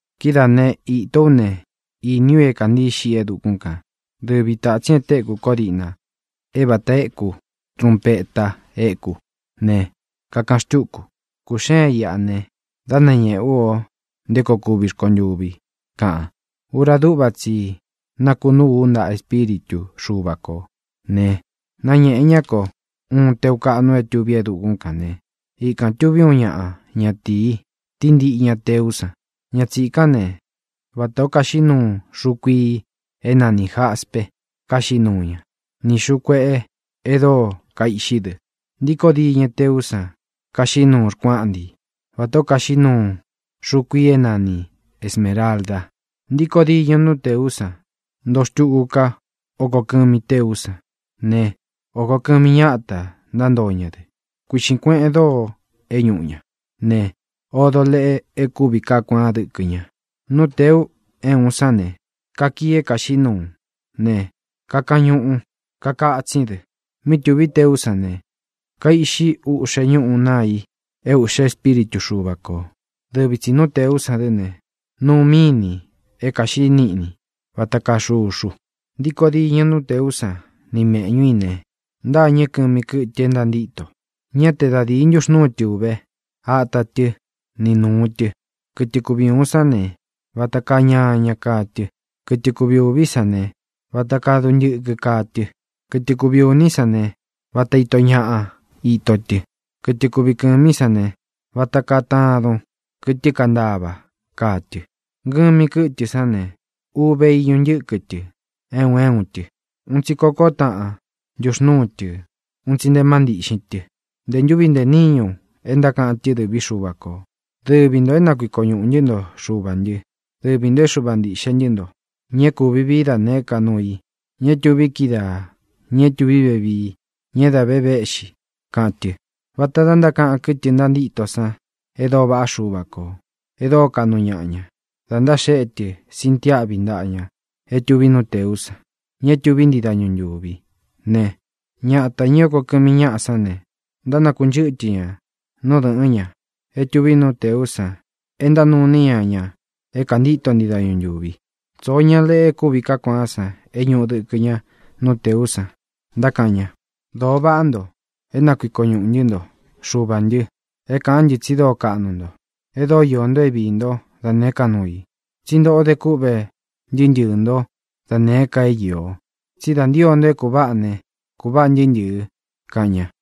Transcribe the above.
Kidáa ne, īto ú ne, iní u é kāntií xiꞌi e dukún kān. Dɨvi tātsín e téku ko díꞌna é vata eku trūnpeta éku ne, kakaꞌan xtúku: —Kūxeen iꞌá ne, dá nañēꞌe ú o nté koo kuvi rkontuvi —kaꞌan. Ura dúꞌva tsi i nakunúu u ntaꞌa Espíritu Xuva kō ne, náñēꞌe ñá ko uun teu kaꞌnu é tuví e dukún kan ne, ikān tuví uun ñaꞌa ñatīi, tíntiꞌi ña nú tēú san. Ña tsīkán ne, vatā ó kaxiꞌí nuu xuu kuii é nanī jaspe kaxiꞌí nuu ña, ni xūu kueꞌe e dóo kaiꞌxí dɨ. Ntíkō diñɨ nú tēú san kaxiꞌí nuu rkuáꞌnti, vatā ó kaxiꞌí nuu xuu kuii é nani esmēralda. Ntíkō diñɨ nú tēú san ntoo xtuku ká oko kɨmi téú san ne, oko kɨ́mi ñāta ntántoo ña dɨ. Kuiꞌxīn kueꞌen dóo é ñūꞌu ña ne, odo leꞌe e kúvi kaá kuaán dɨkɨ ña. Nú tēu é uun sán ne, kakii é kāxiꞌí nuu ne, kakañuꞌu, kakatsín dɨ. Mí tūví teú san ne, kaiꞌxi úꞌxe ñúꞌū naa i é ūꞌxe espíritu Xuva kō. Dɨvi tsī nú tēú san dɨ́ ne, nuu mínī é kāxiꞌí niꞌni vata kaa xuxu. Ntíkō diñɨ nú tēú san ni mēꞌñú i ne, ntâñɨ́ kɨmi kɨ́tɨ é ntantíto. Ñá te da dīi ntuxnúu tɨ uve ata tɨ́ ni nūu tɨ. Kɨtɨ kuvi ūun sán ne, vata kaa ñaña kaa tɨ. Kɨtɨ kuvi ūví san ne, vata kaa duntɨkɨ kaa tɨ. Kɨtɨ kuvi ūní san ne, vata ito ñaꞌa ito tɨ̄. Kɨtɨ kuvi kɨ̄mí san ne, vata kaa tadun kɨ́tɨ kantava kaa tɨ. Ngɨmi kɨ́tɨ sán ne, uve iñu ntiꞌxin tɨ é un é un tɨ. Un tsi kokó taꞌan ntuxnūú tɨ un tsi nte má ntiꞌxin tɨ. Ntē ntúvi ntē níñu e ntákaꞌan tɨ́ dɨ̄ví Xuva kō: ¡Dɨvi ntō é na kuiko ñuꞌū ntɨ́ nto, Xuvā ntɨ́. Dɨvi ntō é Xuva ntīꞌxe ntɨ́ nto, ña é kuvi vií da nēé ka nuu i, ña é tuvi kídaa, ña é tuví vevii, ña é dā ve véꞌxi!, kaꞌan tɨ. Vāta da ntákaꞌan kɨ́tɨ ntantíto san e dóo vaꞌá Xuva kō, e dóo kaꞌnu ñaꞌa ña, dā ntaxéꞌe tɨ sintiáꞌvi ntaꞌa ña é tuví nú tēú san, ña é tuví ntii dañu ntūvi ne, ñata, ñā é oko kɨmi ñáꞌa sán ne, ntánakunchɨ́tɨ ña nú dɨ̄ꞌɨ́n ña é tuví nú tēú san é ntánuu iní ña ña é kāntíto ntii dañu ntūvi. Tsoo ñá leꞌe e kúvi kaá kuaan é ñūꞌu dɨkɨ ña nú tēú san, ntákaꞌan ña: Dōo vaꞌá nto, é nakuiko ñuꞌū ntɨ́ nto, Xuvā ntɨ, é kāꞌán ntɨ tsi dóo kaꞌnu nto, e dóo iō nto é viī ntó da nēé ka nuu i. Tsí ntoꞌo de kúꞌve ntɨɨ́ ntɨɨ̄ nto dá nēé ka é īo. Tsí da ntío nto é kūváꞌa ne, kūváꞌa ntɨɨ́ ntɨ̄ɨ, kaꞌan ña.